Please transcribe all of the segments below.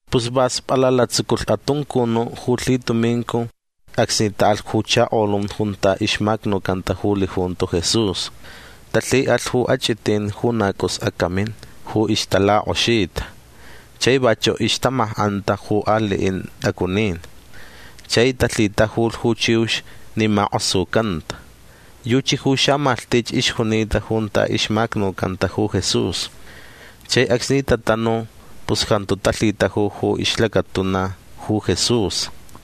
Pus va spalala tsuculh atuncunu' ju lhitumincu acsni ta'alh ju chakolun junta ixmacnucanta ju lijunto Jesús. Talhi'alh ju ach'itin ju na c'us acamin ju ixtalak'oxita. Chai vachu' ixtamak'anta ju ali'in t'acunin. Chai talhitajulh ju chiux ni mak'osucanta. Yuchi ju xamalhtich ixjunita junta ixmacnucanta ju Jesús. Chai acsni tatanu pus jantu talhitaju ju ixlacatuna ju Jesús.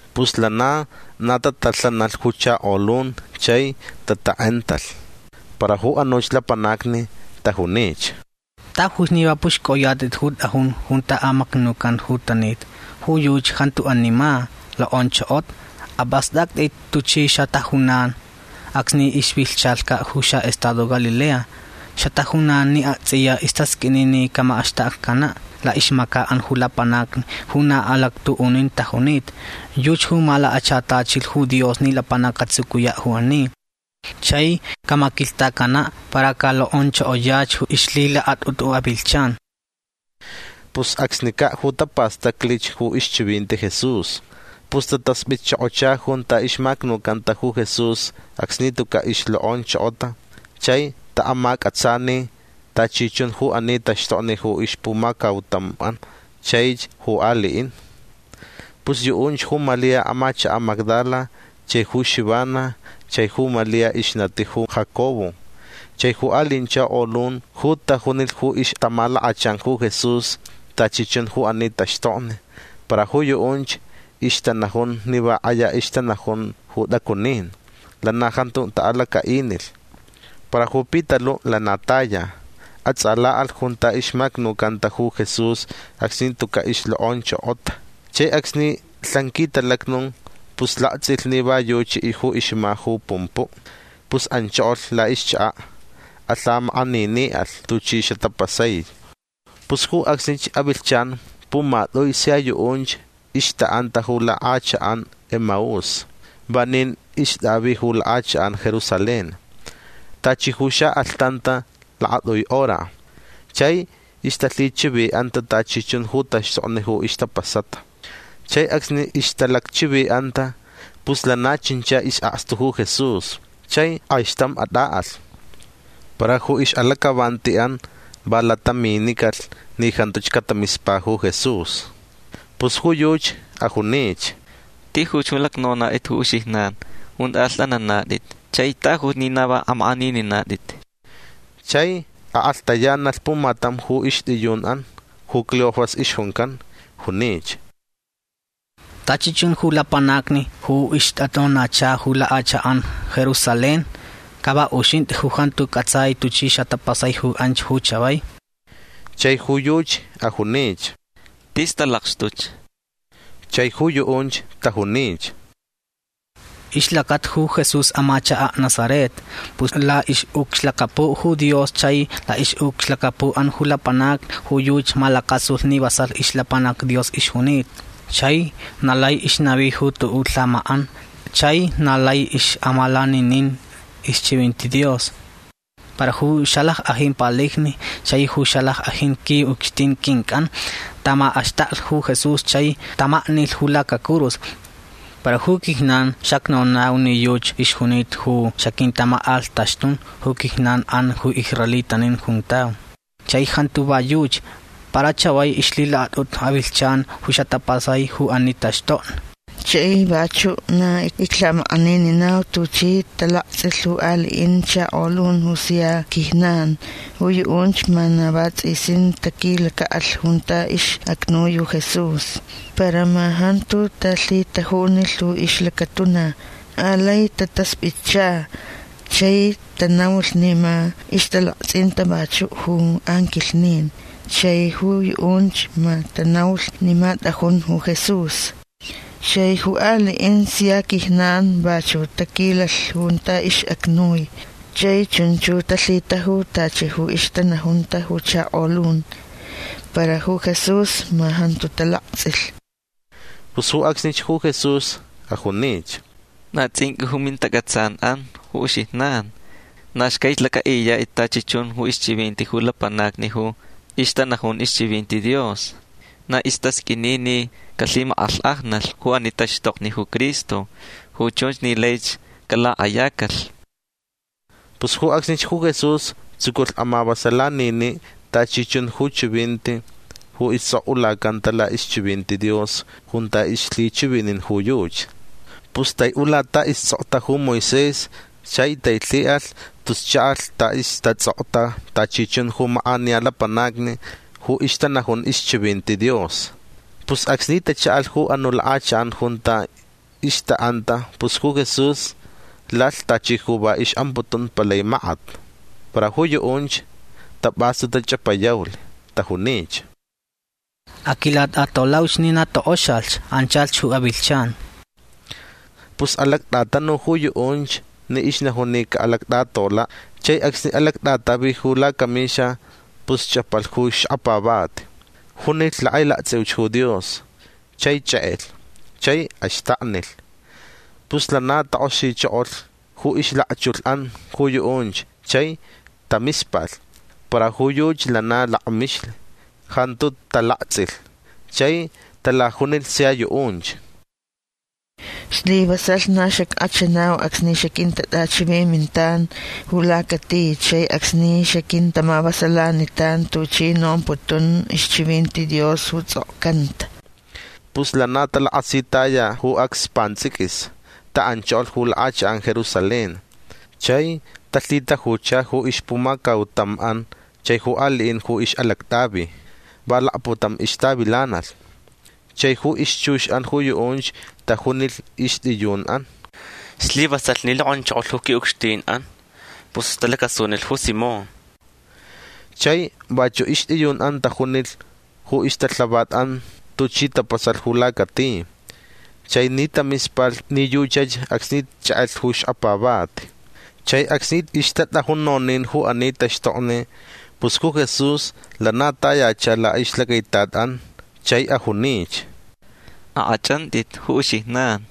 Pus lana na tatalhanalh ju chakolun chai tatak'entalh. Para ju anuch lapanacni tajunich: ―Tajuch ni va p'uxc'oyat'it ju t'ajun junta amacnucan ju tanita. Ju yuchi jantu ani ma. Lok'onchokota. Ap'ast'act'it tuchi xatajunan acsni ixvilhchalhca' ju xa'estado Galilea. Xatajunan ni akts'iya istasq'uini ni camak'axtakcana' la'ixmaca'an ju lapanacni ju na alactu'unin tajunita. Yuchi ju malakachatachilh ju Dios ni lapanac catsucuya' ju ani. Chai camaquilhtacana' para calok'onchokoyach ju ixlhilakat'utu avilhchan. Pus acsnica' ju tapastaclich ju ixchivinti ju Jesús. Pus tatasp'itchokocha junta ixmacnucanta ju Jesús acsni tuca' ixlok'onchokota chai ta'amac'atsani tachi chun ju ani taxtokni ju ixpumacautam'an chaich ju ali'in. Pus yu'unch ju Malia amachaka' Magdala chai ju Xivana chai ju Malia ixnati ju Jacobo chai ju ali'in chakolun ju tajunilh ju ixtamalakachan ju Jesús tachi chun ju ani taxtokni. Para ju yu'unch ixtanajun ni va k'aya ixtanajun ju t'acunin. Lana jantu ta'alaca'inilh. Para ju Pitalu' lana taya. Ats'ala'alh junta ixmacnucanta ju Jesús acsni tuca' ixlok'onchokota. Chai acsni lhan quitalacnu pus lakts'ilh ni va yuchi ju ixma ju pumpu'. Pus anchokolh la'ixchaka'. Alhamak'anini'alh tuchi xatapasai. Pus ju acsnich avilhchan pumat'ui sia yu'unch ixta'anta ju lak'achak'an Emaús. Vanin ixt'avi ju lak'achak'an Jerusalén. Tachi ju xa'alhtanta lakat'ui hora. Chai ixtalhichivi'anta tachi chun ju taxtokni ju ixtapasata. Chai acsni ixtalacchivi'anta pus lana chincha is'akstu ju Jesús chai k'aixtam at'a'alh. Para ju ix'alac'avanti'an va lataminicalh ni jantuch catamispa ju Jesús. Pus ju yuchi ajunich: ―Tijuch ju lacnonat'it ju uxijnan junta alht'ananat'it. Chai tajuch ni na va amak'anininat'it. Chai ak'alhtayanalh pumatam ju ixt'iyun'an ju Cleofas ixjuncan. Junich: ―Tachi chun ju lapanacni ju ixtat'onacha ju lak'achak'an Jerusalén ca va uxint'i ju jantu c'ats'ai tuchi xatapasai ju anch ju chavai. Chai ju yuchi ajunich: ―Tis talakxtuch. Chai ju yu'unch tajunich: ―Ixlacata ju Jesús amachaka' Nazaret. Pus la'ix'ucxlacapu' ju Dios chai la'ix'ucxlacapu'an ju lapanacni ju yuchi malacasulh ni vasalh ixlapanac Dios ixjunita. Chai na lai ixnavi ju tu'u' lhamak'an chai na lai ix'amalaninin ixchivinti Dios. Para ju xalack'ajin palijni chai ju xalack'ajin qui'ucxtin quinc'an tamak'axtaklh ju Jesús chai tamaknilh ju lacacurus. Para ju quijnan xacnonau ni yuchi ixjunita ju xaquintamak'alhtaxtun ju quijnan'an ju israelitanin juntau. Chai jantu va yuchi. Para chavai ixlhilakat'utu avilhchan ju xatapasai ju ani taxtokni. Chai vachu' na iclhamak'anininau tuchi talakts'ilh ju ali'in chakolun ju sia quijnan. Ju yu'unch ma na vats'isin taquilaca'alh junta ix'acnui ju Jesús. Para ma jantu talhitajunilh ju ixlacatuna. Alai tatasp'itcha chai tanaulh ni ma ixtalakts'inta vachu' ju anquilhnin. Chai ju yu'unch ma tanaulh ni ma t'ajun ju Jesús. Chai ju ali'inch sia quijnan vachu' taquilalh junta ix'acnui chai chunch ju talhitajulh tachi ju ixtanajunta ju chakolun. Para ju Jesús ma jantu talakts'ilh. Pus ju acsnich ju Jesús ajunich: ―Na ts'inq'ui ju mintac'atsan'an ju uxijnan. Na xcaich lac'a'iyat'it tachi chun ixchivinti ju lapanacni ju ixtanajun ixchivinti Dios. Na istasq'uini ni calhimak'alhk'ajnalh ju ani taxtokni ju Cristo. Ju chunch ni laich calak'ayacalh. Pus ju acsnich ju Jesús tsuculh amavasalanini' tachi chun ju chivinti ju ists'ok'ulacanta la'ixchivinti Dios junta ixlhichivinin ju yuchi. Pus tai'ula ta ists'okta ju Moisés chai tailhi'alh tus cha'alh ta istats'okta tachi chun ju mak'aniya lapanacni ju ixtanajun ixchivinti Dios. Pus acsni tacha'alh ju anu' lak'achak'an junta ixta'anta pus ju Jesús lalh tachi ju va ix'amputun palai makat. Para ju yu'unch tap'astu tach'apayaulh. Tajunich: ―Aquilat'atolauch ni na tok'oxalh. Anchalh ju avilhchan. Pus alact'atanu ju yu'unch ni ixnajun ni ca'alact'atola'. Chai acsni alact'atavi ju lacamixa pus ch'apalh ju xkapavati. Junilh lak'ailakts'iuch ju Dios chai ch'ek'elh chai axtaknilh. Pus lana tak'oxichokolh ju ixlakchulh'an ju yu'unch chai tamispalh. Para ju yuchi lana lakmixlh. Jantu talakts'ilh. Chai talajunilh sia yu'unch: ―Slivasalh na xack'achanau acsni xaquintat'achivimintan ju lacati. Chai acsni xaquintamavasalanitan tuchi nomputun ixchivinti Dios ju ts'okcanta. Pus lana talakasitaya ju acs pants'iquis. Ta'anchokolh ju lak'achak'an Jerusalén. Chai talhitajucha ju ixpumacautam'an chai ju ali'in ju ix'alact'avi. Va lakputam ixtavilanalh. Chai ju ixchux'an ju yu'unch tajunilh ixt'iyun'an: ―Slivasalh ni lok'onchokolh ju qui'ucxtin'an. Pus talacasunilh ju Simón. Chai vachu' ixt'iyun'an tajunilh ju ixtalhavat'an tuchi tapasalh ju lacati chai ni tamispalh ni yuchach acsni ch'ek'elh ju xkapavati. Chai acsni ixtat'ajun nonin ju ani taxtokni pus ju Jesús lana tayacha la'ixlacaitat'an chai ajunich: ―Ak'ach'ant'it ju uxijnan.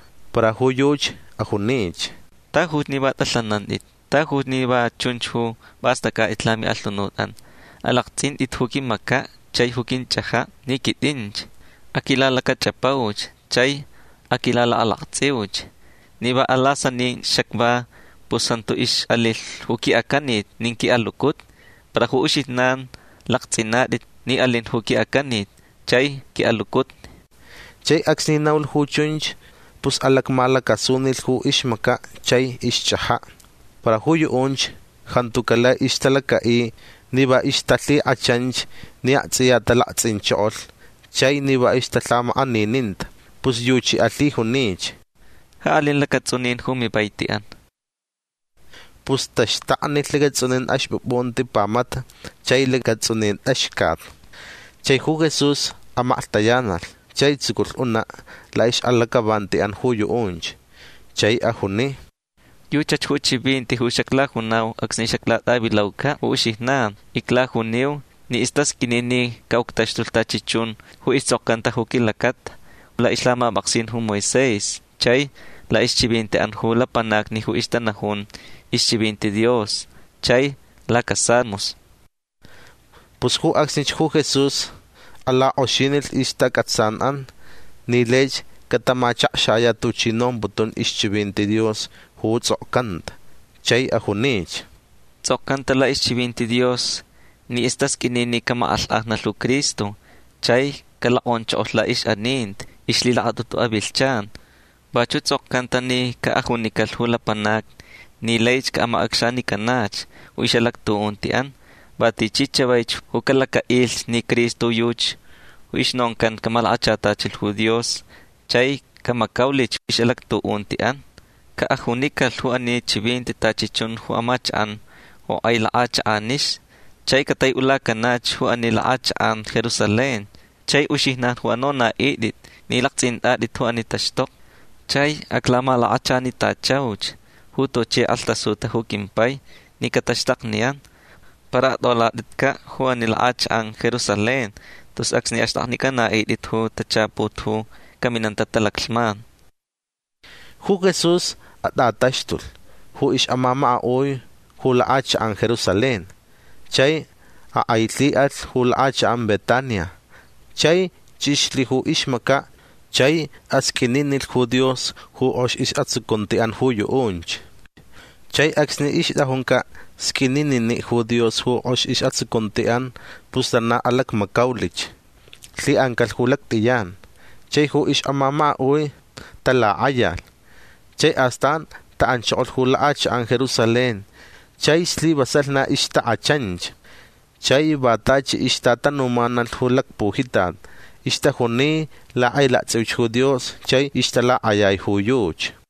Para ju yuchi ajunich: ―Tajuch ni va t'alhanant'it. Tajuch ni va chunch ju p'ast'ac'at'it lami'alhunut'an. Alakts'int'it ju quimaca' chai ju quinch'aja' ni quit'inch. Aquilalacach'apauch chai aquilalakalakts'iuch. Ni va alasanin xacva pus jantu ix'alilh ju qui'acanit nin qui'alucutni. Para ju uxijnan lakts'inat'it ni alin ju qui'acanit chai qui'alucutni. Chai acsni naulh ju chunch pus alacmalacasunilh ju ixmaca' chai ixch'aja'. Para ju yu'unch jantuca' lai ixtalaca'i ni va ixtalhik'achanch ni akts'iya talakts'inchokolh chai ni va ixtalhamak'anininta. Pus yuchi alhijunich: ―Ja alin lacats'unin ju mivaiti'an. Pus taxtaknilh lacats'unin axp'up'unti pamata chai lacats'unin t'axcat. Chai ju Jesús amaklhtayanalh chai tsuculh una' la'ix'alac'avanti'an ju yu'unch. Chai ajuni: ―Yuchach ju chivinti ju xaclajunau acsni xaclat'avilauca' ju uxijnan. Iclajuniu ni istasq'uini ni ca'uctaxtulh tachi chun ju ists'okcanta ju quilacata la'ixlhamap'aksin ju Moisés chai la'ixchivinti'an ju lapanacni ju ixtanajun ixchivinti Dios chai lacasalmos. Pus ju acsnich ju Jesús alak'oxinilh ixtac'atsan'an ni laich catamachakxaya' tuchi nomputun ixchivinti Dios ju ts'okcanta. Chai ajunich: ―Ts'okcanta la'ixchivinti Dios ni istasq'uini ni camak'alhk'ajnalh ju Cristo chai calok'onchokolh la'ix'aninti ixlhilakat'utu avilhchan. Vachu' ts'okcanta ni ca'ajunicalh ju lapanacni ni laich ca'amac'acxanicanach ju ix'alactu'unti'an va tichi chavaich ju calaca'ilh ni Cristo yuchi ju ixnoncan camalakachatachilh ju Dios chai camacaulich ix'alactu'unti'an. Ca'ajunicalh ju ani chivinti tachi chun ju amachak'an ju k'ai lak'achak'anixni. Chai catai'ulacanach ju ani lak'achak'an Jerusalén. Chai uxijnan ju anona'it'it ni lakts'int'at'it ju ani taxtokni. Chai aclamalakachanitachauch ju tuchi k'alhtasuta ju quimpai ni cataxtakniyan. Para at'olat'itca' ju ani lak'achak'an Jerusalén tus acsni axt'aknic'ana'it'it ju tachaput ju caminanta talaclhman. Ju Jesús at'ataxtulh ju ix'amamaka'ui ju lak'achak'an Jerusalén. Chai ak'ailhi'alh ju lak'achak'an Betania. Chai ch'ixlh ju ixmaca' chai asq'uininilh ju Dios ju k'ox is'atsucunti'an ju yu'unch. Chai acsni ixt'ajunca' sq'uininini' ju Dios ju k'ox is'atsucunti'an pus lana alacmacaulich. Lhi'ancalh ju lact'iyan. Chai ju ix'amamaka'ui talak'ayalh. Chai astan ta'anchokolh ju lak'achak'an Jerusalén chai slivasalh na ixtak'achanch. Chai va tachi ixtatanumanalh ju lacpujitat. Ixtajuni lak'ailakts'iuch ju Dios chai ixtalak'ayai ju yuchi.